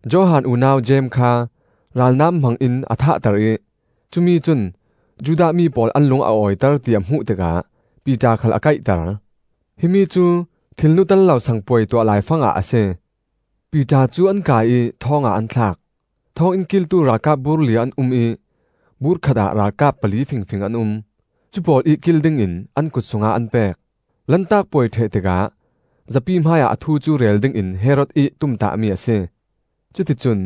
Johan unau Jeim kha ralnam hmang-in a thahter ih, cumi cun Judah mi pawl an lung a awiter ti a hmuh tikah Piter khal a kaihter. (Himi cu Thilnu tello Sang Puai tuah laifangah a si.) Piter cu an kai ih thawngah an thlak; thawnginn kiltu ralkap bur li an um ih bur khatah ralkap pali fingfing an um; cu pawl ih kil dingin an kut sungah an pek. Lantak puai ṭheh tikah zapi hmaiah a thu cu rel dingin Herod ih tumtahmi a si. Cuti cun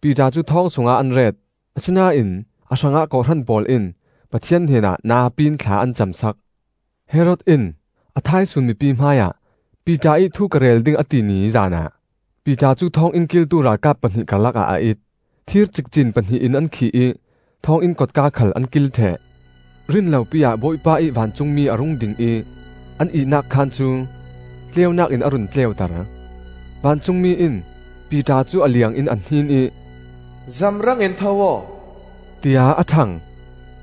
Piter cu thawng sungah an ret, asinain a hrangah kawhhran pawl in Pathian hnenah napi in thla an camsak. Herod in a thaisun mipi hmaiah Piter ih thu ka rel ding a ti ni zanah Piter cu thawnginn kiltu ralkap pahnih karlakah a it. Thir cikcin pahnih in an khih ih thawnginn kotka khal an kil ṭheh. Rinlopi-ah Bawipa ih vancungmi a rung ding ih an ihnak khaan cu tleunak in a run tleuter. Vancungmi in Piter cu a liang in a hnin ih, “Zamrang in tho aw!” tiah a ṭhang.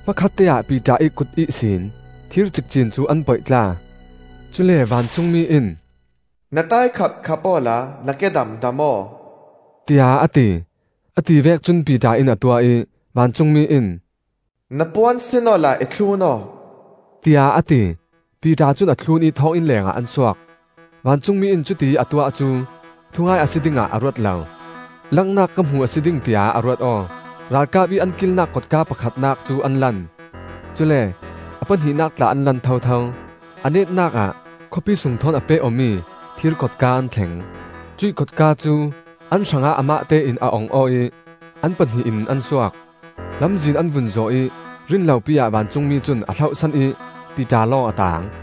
Hmakhatte-ah Piter ih kut ihsin thir cikcin cu an poihtla. Cule vancungmi in, “Na taikhap khap awla na kedam dam aw,” tiah a ti. A tivek cun Piter in a tuah ih vancungmi in, “Na puan sin awla i thlun aw,” tiah a ti. Piter cun a thlun ih thawnginn lengah an suak; vancungmi in cuti ih a tuah cu thungai a si dingah a ruat lo; langnak ka hmu a si ding, tiah a ruat aw. Ralkap ih an kilnak kotka pakhatnak cu an lan, cule a pahnihnak tla an lan thotho. A netnak ah khawpi sung thawn a peh-awmi thir kotka an thleng. Cuih kotka cu an hrangah amahte in a ong aw ih an pahnih in an suak. Lamzin an vun zawh ih rinlopi ah vancungmi cun a hlohsan ih Piter lawng a taang.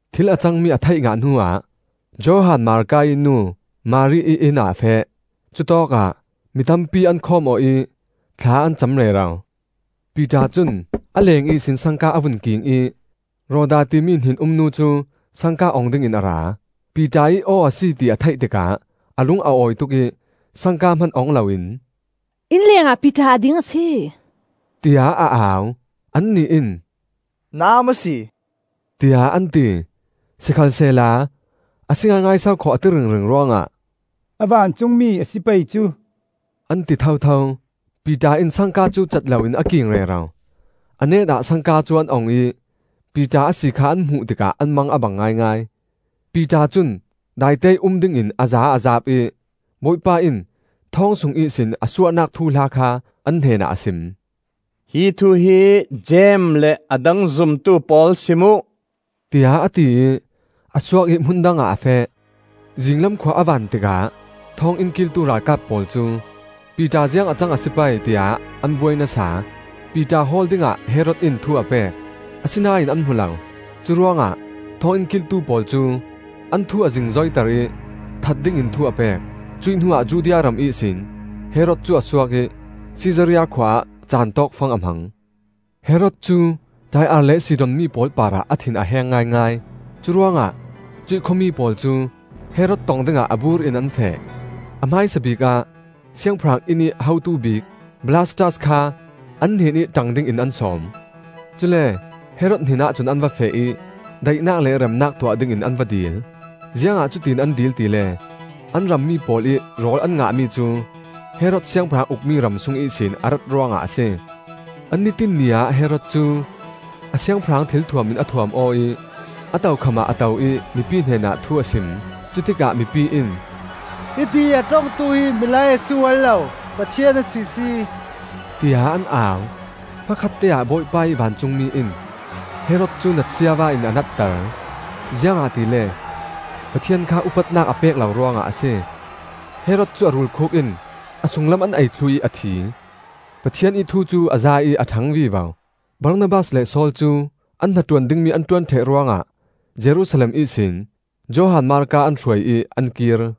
Thil a cangmi a theih ngah hnuah Johan Marka ih nu Mari ih inn ah a feh; cutawkah mi tampi an khawm aw ih thla an cam rero. Piter cun a leng ihsin sangka a vun king ih Roda timi hnen-um nu cu sangka ong dingin a ra. Piter ih aw a si ti a theih tikah a lung a awi tuk ih sangka hman ong loin, “Inn lengah Piter a ding a si!” tiah a au. Annih in, “Na aa maw si?” tiah an ti. Sikhalsehla, a si ngaingai sokhaw, a ti ringring ruangah, “A vancungmi a si pei cu!” an ti thotho. Piter in sangka cu cat loin a king rero. A net-ah sangka cu an ong ih Piter a si kha an hmuh tikah an mang a bang ngaingai. Piter cun daiteih um dingin a zaa a zaap ih, Bawipa in thawng sung ihsin a suahnak thuhla kha an hnenah a sim. “Hi thu hi Jeim Jeim hi Jesuh ih naupa Jeim a si. le a dang zumtu pawl sim uh,” tiah a ti ih a suak ih hmun dangah a feh. Zinglam khua a van tikah thawnginn kiltu ralkap pawl cu, Piter ziang a cang a si pei, tiah an buai nasa. Piter hawl dingah Herod in thu a pek; asinain an hmu lo. Curuangah thawnginn kiltu pawl cu an thu a zingzoiter ih that dingin thu a pek. Cuih hnuah Judea ram ihsin Herod cu a suak ih Sisaria khua ah caan tawkfang a hmang. Herod cu Tai-ar le Sidon mi pawl parah a thin a heng ngaingai; curuangah cuih khuami pawl cu Herod tong dingah a bur in an feh. A hmaisabik ah siangpahrang innih hotu bik Blastas kha an hnenih ṭang dingin an sawm. Cule Herod hnenah cun an va feh ih daihnak le remnak tuah dingin an va dil. Ziangah cutiin an dil tile an rammi pawl ih rawl an ngahmi cu Herod siangpahrang ukmi ram sung ihsin a rat ruangah a si. An ni tinh ni ah Herod cu a siangpahrang thilthuam in a thuam aw ih a tokham ah a to ih mipi hnenah thu a sim. Cutikah mipi in, “Hitiih a ṭongtu hi milai a si ual lo, pathian a sisi!” tiah an au. Hmakhatte-ah Bawipa ih vancungmi in Herod cu natsiava in a natter, ziangahtile Pathian kha upatnak a pek lo ruangah a si. Herod cu a rulkhuk in a sunglam an ei thluh ih a thi. Pathian ih thu cu a zai ih a ṭhang vivo. Barnabas le Saul cu an hnaṭuan dingmi an ṭuan ṭheh ruangah Jerusalem ihsin Johan Marka an hruai ih an kir.